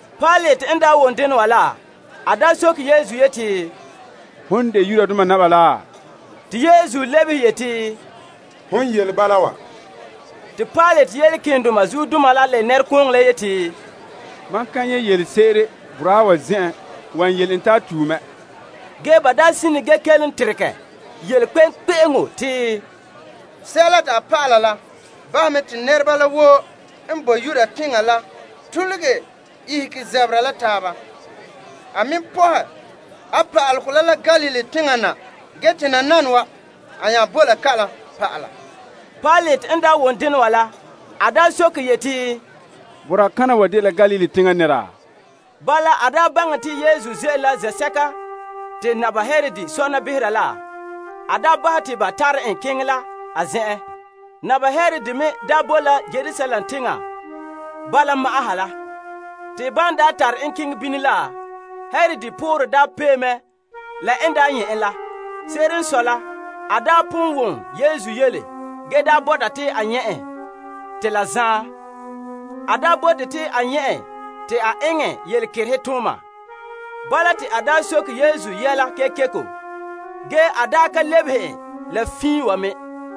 Pilate n wom dena wa la, a soke Yesu yeti, Hom n de Yudoma naba laa? Te Yesu lebehe yeti, Hon yele bala wa. Te Pilate yele malema keendoma la la nɛrekooŋɔ la te, Mam ka nyɛ' yelese'ere boraa wa zen'en wan yele en te a tue mɛ. Ge ba sine ge kelom yeti, Sɛla te a pa'ala la bahɛ mɛ te nɛreba la woo n boe Yuda teŋa la tuluge ihege zabera la taaba. A me pɔhɛ a pa'alegɔ la la Galilee teŋa na ge te nananawa, a nya boe la kalam pa'ala. Pilate n daa wom dena wa la, a soke yeti, Boraa kana wa dela Galilee teŋa nɛra? Bala, en ta baŋɛ te Yesu ze'ele la zen'sɛka te Naba Herod sɔna behera la, a bahɛ te ba tare en keŋɛ la a zen'en. Naba Herod me boe la Yerusalem teŋa bala ma'an ha la. Te ban tare en keŋɛ bini la, Herod poorɛ pee mɛ la n nyɛ' en la. Se'ere n sɔe la, a daa pon wom Yesu yele ge daa bɔta te a nyɛ' en te la zaan. A daa bote te a nyɛ' en te a eŋɛ yelekerehe tooma. Bala te a soke Yesu yɛla kekeko. Ge a ka lebehe en la fiin wa me.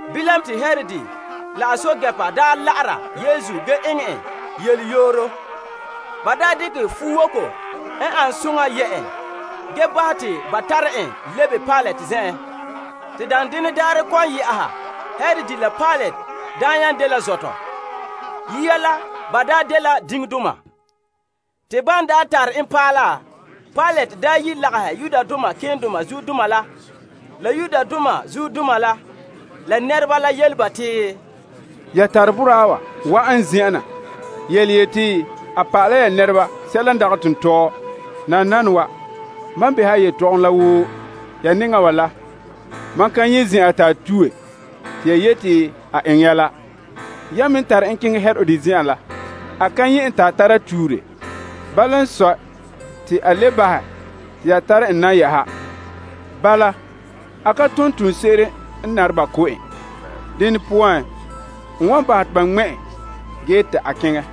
Bilam te Herod la a guruba la'ara Yesu ge eŋɛ en yeleyooro. Ba dekɛ fuwoko n ane soŋa yɛ' en ge bahɛ te ba tare en lebe Pilate zen'en. Te daanden daarɛ kɔ'ɔn yɛ'ɛha, Herod la Pilate nya dela zɔtɔ. Yia la, ba daa dela diŋdoma. Te ban daa tare en paɛ la, Pilate yi lagahɛ malemadaana la zuodoma la nɛreba la yele ba te, Ya tare boraa wa wa'an n zen'en na yele yete a pa'ale la ya nɛreba sɛla n dagɛ tontɔɔ. Nananawa, mam behɛ a yetɔgom la woo ya nɛŋa wa la, mam ka nyɛ' zen'an te a tue te ya yete a eŋɛ ya la. Ya me tare en keŋɛ Herod zen'en la, a ka nyɛ' en te a tara tuure. Bala n sɔe te a le bahɛ te ya tare en na yɛ'ɛha. Bala, a ka tom toonse'ere n nare ba ko' en. Dene poan, n wan bahɛ te ba ŋmɛ' en ge te a keŋɛ.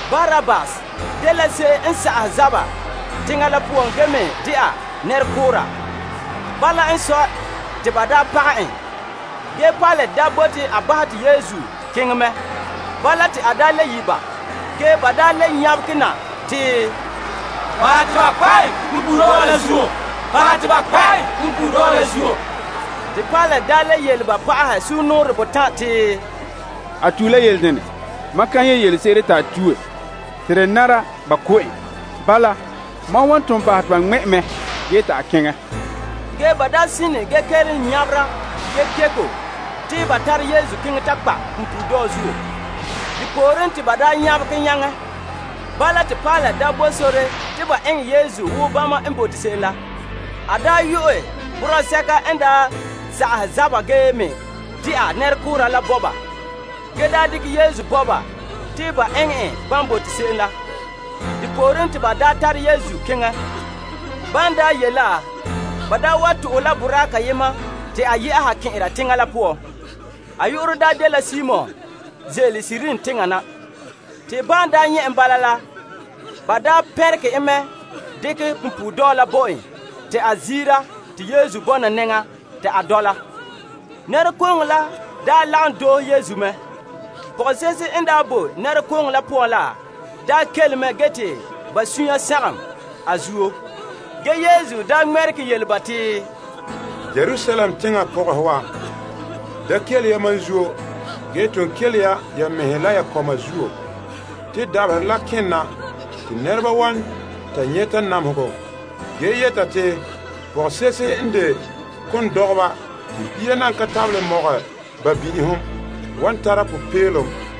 Barabbas dela se'em n sa'ahɛ zaba teŋa la poan ge me dɛna nɛrekoora. Bala n sɔe, te ba daa pagɛ en. Pilate daa bote a bahɛ te Yesu keŋɛ mɛ. Bala te a le yi' ba. Ge ba nyabegɛ na te, Bahɛ te ba kpa' en punpuuredɔɔ la zuo! Bahɛ te ba kpa' en punpuuredɔɔ la zuo! Pilate le yele ba pa'aha sugumnɔɔren botan' te, A tue la yele dene? Mam ka nyɛ' yelese'ere te a tue te de nara ba ko' en. Bala mam wan ton bahɛ te ba ŋmɛ' en mɛ ge te a keŋɛ. Ge ba sine ge kelom nyabera kekeko te ba tare Yesu keŋɛ ta kpa' en punpuuredɔɔ zuo. Te pooren te ba nyabɛ nyaŋɛ. Bala te Pilate bo sore te ba eŋɛ Yesu wo bama n bote se'em la. A yu'ɛ boraa sɛka n daa sa'ahɛ zaba ge me dɛna nɛrekoora la bahɛ bo ba, ge dekɛ Yesu bo ba te ba eŋɛ en bama n bote se'em la. De pooren te ba daa tare Yesu keŋɛ. Ban ye' la, ba wa tuhɛ boraa kayema te a yɛ'a kɛn'ɛra teŋa la poan. A yu'urɛ dela Simon n ze'ele Kirene teŋa na. Te ba pɛnregɛ en mɛ dekɛ punpuuredɔɔ la bo en te a ziira te Yesu bɔna nɛŋa ta a dɔla. Nɛrekooŋɔ lagom doohe Yesu mɛ. Pɔgɔse'ehe n boe nɛrekooŋɔ la poan la kele mɛ ge te ba sunya sagom a zuo. Yesu ŋmɛregɛ yele ba te, Yerusalem teŋa pɔgɔhe wa, da kele ya mam zuo ge ton kele ya ya mɛhe la ya kɔma zuo. Te dabaherɛ la kena te nɛreba wan ta nyɛta namehegɔ, ge yɛta te, pɔgɔse'ehe n de kondɔgɔba te bia nan ka tabelɛ mɔgɛ ba bin'ihom wan tara popeelom.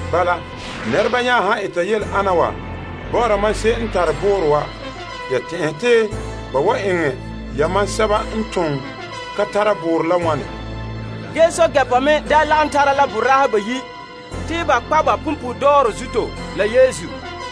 Bala nɛreba nya han eta yele ana wa bɔ'ɔra mam se'em n tare boorɔ wa, ya tɛn'ɛhe te ba wan eŋɛ yamam sɛba n ton ka tare boorɔ la wane? Ge ba me daa lagom tara la boraahe bayi' n sagom yele te ba kpa' ba punpuuredɔɔ zuto la Yesu.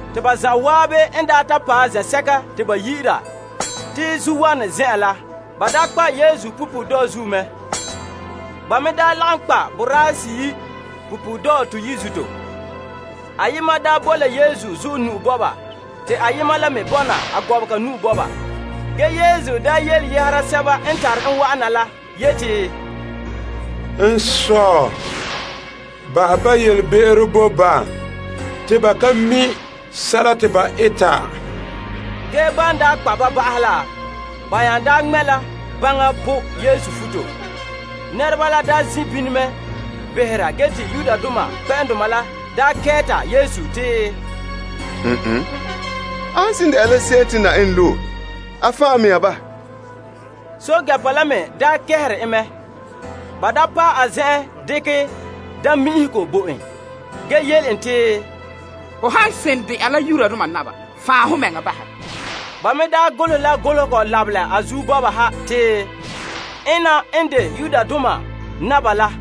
Te ba zan'an n ta paɛ zen'sɛka te ba yi'ira te Zuowanɛ Zen'an la, ba kpa' Yesu punpuuredɔɔ la mɛ. Ba me lagom kpa' boraahe seyi' punpuuredɔɔ toyi' me zuto. Ayema bo la Yesu zuɔ te ayema la me bɔna a gɔbega. Ge Yesu yele yɛhera sɛba n tare en wa'ana la yeti, N Sɔ', bahɛ ba yelebe'ero bo ba. Te ba ka mi' sɛla te ba eta. Ge ban daa kpa' ba ba'ahɛ la, ba nya daa ŋmɛ' la gbaŋa po' Yesu futo. Nɛreba la ze' bini mɛ behera ge te kpɛ'ɛndoma la kɛɛta Yesu te, A han seren dɛna la se'em te Na'ayenɛ loe, a fan' a mɛŋa bahɛ. Guruba la me kɛɛre en mɛ. Ba paɛ a zen'en dekɛ daammi'inhego bo en, ge yele en te, Ho han seren dɛna la Yudoma naba, fan' ho mɛŋa bahɛ. Ba me golehɛ la golehegɔ lamenɛ a zuo bɔba ha te, Ena n de Yudoma naba la.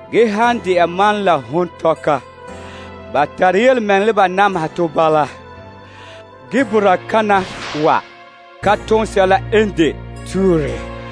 Ge han de'a mam la hon tɔka, ba tare yelemɛŋɛrɛ la ba nameha tɔ bala. Ge boraa kana wa ka tom sɛla n de tuure.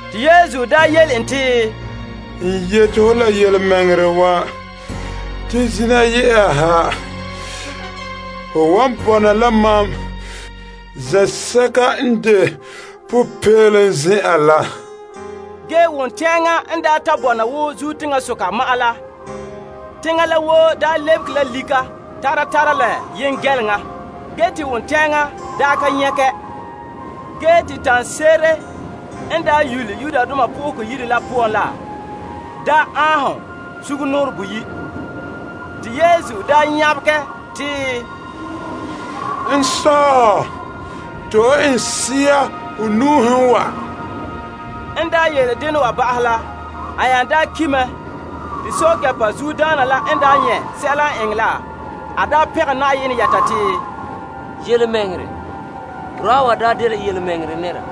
Yesu yele en te, N yete ho la yelemɛŋɛrɛ wa. Te zina yɛ'ɛha, ho wan bɔna la mam zen'sɛka n de popeelom zen'an la. Wontɛɛŋa n daa ta bɔna wo zuo teŋasoka ma'an la, teŋa la woo lɛbege la lika tara tara la yengɛleŋa te wontɛɛŋa ka nyagɛ. Ge te tanɛ se'ere n daa yole Yenɛ Yire la poan la aanhom sugumnɔɔren boyi'. Yesu nya nyabegɛ te, N Sɔ', to'e n sea ho nu'uhen wa. En yele dena wa ba'ahɛ la, a nya ki' mɛ. Guruba zuodaana la n nyɛ' sɛla n eŋɛ la, a pɛngɛ Na'ayenɛ yɛta te, Yelemɛŋɛrɛ, boraa wa daa dela tontɔɔ nɛra.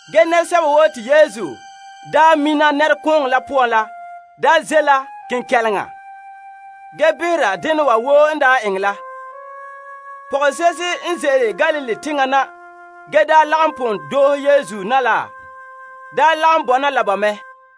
Nɛresɛba woo te Yesu mina la nɛrekooŋɔ la poan la ze' la kenkɛleŋa ge behera dena wa woo n eŋɛ la. Pɔgɔse'ehe n ze'ele Galilee teŋa na ge daa lagom pon doohe Yesu me bɔna la ba mɛ.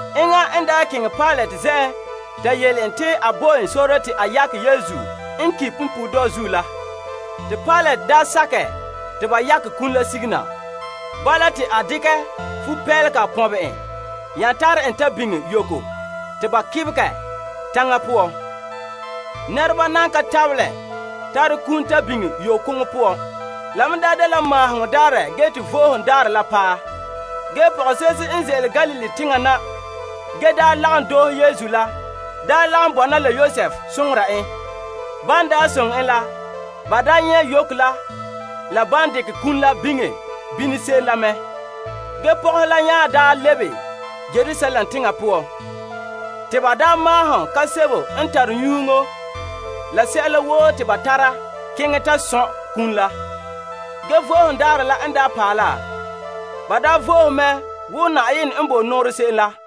Enŋa n keŋɛ Pilate zen'en ta yele en te a bo en sore te a yakɛ Yesu n ki' punpuuredɔɔ zuo la. Te Pilate sakɛ te a yakɛ iŋa la sige na. Bala, te a dekɛ fupeelega pɔnbɛ en nya tare en ta biŋe yogo te ba kebegɛ taŋa poan. Nɛreba nan ka tabelɛ tare kum ta biŋe yokoŋɔ poan. La me dela Maaheŋɔ Daarɛ ge te Vo'ohogo Daarɛ la paɛ. Ge pɔgɔse'ehe n ze'ele Galilee teŋa na ge daa pon lagom doohe Yesu la lagom bɔna Yosef te ba daa nyɛ' yogo la la ban dekɛ iŋa la biŋe bini se'em la mɛ. Pɔgɔhe la nya lebe Yerusalem teŋa poan, te ba maahom nyɛga la kaam n tare nyuŋo te ba tare keŋɛ ta sɔn' kum la. Ge Vo'ohogo Daarɛ la n paɛ la, ba vo'ohe mɛ wo Na'ayenɛ n daa bo nɔɔrɛ se'em la.